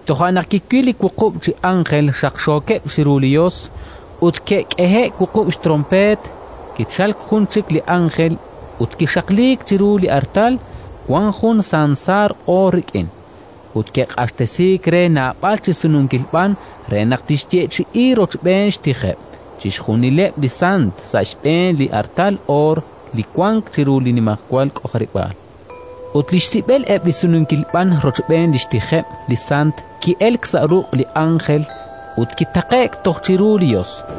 Toja' naq kiwil li wuqub' chi ánjel xaqxookeb' chiru li Yos, ut ke'k'ehe'k wuqub' xtronpeet. Kichalk jun chik li ánjel ut kixaqliik chiru li artal, wank jun sansaar oor rik'in. Ut ke'q'axtesiik re naab'al chi sununkil b'an re naq tixyeechi'i rochb'een xtijeb' chixjunileb' li sant, sa' xb'een li artal oor li wank chiru li nimajwal k'ojarib'aal. Ut li xsib'el eb' li sununkil b'an rochb'een li xtijeb' li sant ki'elk sa' ruq' li ánjel ut kitaqe'k toj chiru li Yos.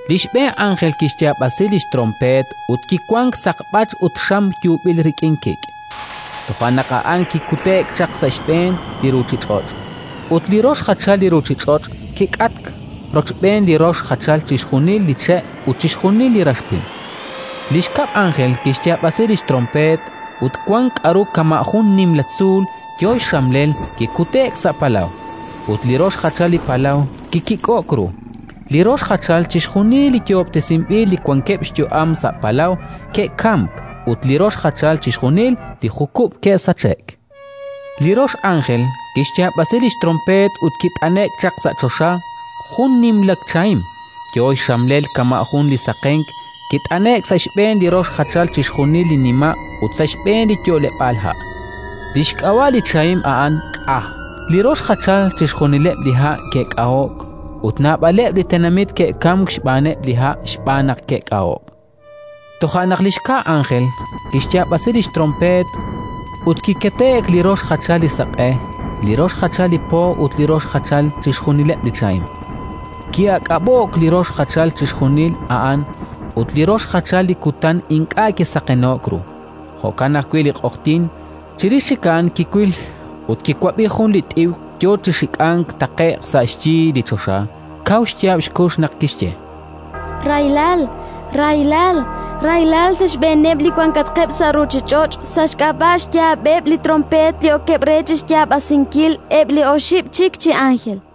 Li xb'een ánjel kixyaab'asi li xtronpeet ut kiwank saqb'ach ut xam yuub'il rik'in kik'. Toja' naq a'an kik'ute'k chaq sa' xb'een li ruuchich'och'. Ut li rox jachal li ruuchich'och' kik'atk, rochb'een li rox jachal chixjunileb' li che' ut chixjunil li rax pim. Li xkab' ánjel kixyaab'asi li xtronpeet, ut wank k'aru kama' jun nimla tzuul yo xxamlel kikute'k sa' palaw, ut li rox jachal li palaw kikik'o'k ru: Li rox jachal chixjunil li yoob'tesinb'il li wankeb' xyu'am sa' palaw ke'kamk ut li rox jachal chixjunileb' li jukub' ke'sache'k. Li rox ánjel kixyaab'asi li xtronpeet, ut kit'ane'k chaq sa' choxa jun li nimla chahim, yo xxamlel kama' jun li saqenk: kit'ane'k sa' xb'een li rox jachal chixjunileb' li nima' ut sa' xb'eeneb' li yo'leb'aal ha'. Li xk'ab'a' li chahim a'an K'a. Li rox jachal chixjunileb' li ha' ke'k'aho'k ut naab'aleb' li tenamit ke'kamk xb'aaneb' li ha', xb'aan naq ke'k'aho'k. Toja' naq li xka ánjel kixyaab'asi li xtronpeet, ut kikete'k li rox jachal li saq'e, li rox jachal li po ut li rox jachal chixjunileb' li chahim: ki'aak'ab'o'k li rox jachal chixjunil a'an, ut li rox jachal li kutan ink'a' kisaqeno'k ru; jo'kan ajwi' li q'oqyink. Chirix chik a'an kiwil ut kiwab'i jun li t'iw yo chi xik'ank taqe'q sa' xyi li choxa, kaw xyaab' xkux naq kixye: “Rahilal, rahilal, rahilal sa' xb'eeneb' li wankatqeb' sa' ruuchich'och', sa' xk'ab'a' xyaab'eb' li tronpeet li okeb' re chi xyaab'asinkil eb' li oxib' chik chi ánjel!”.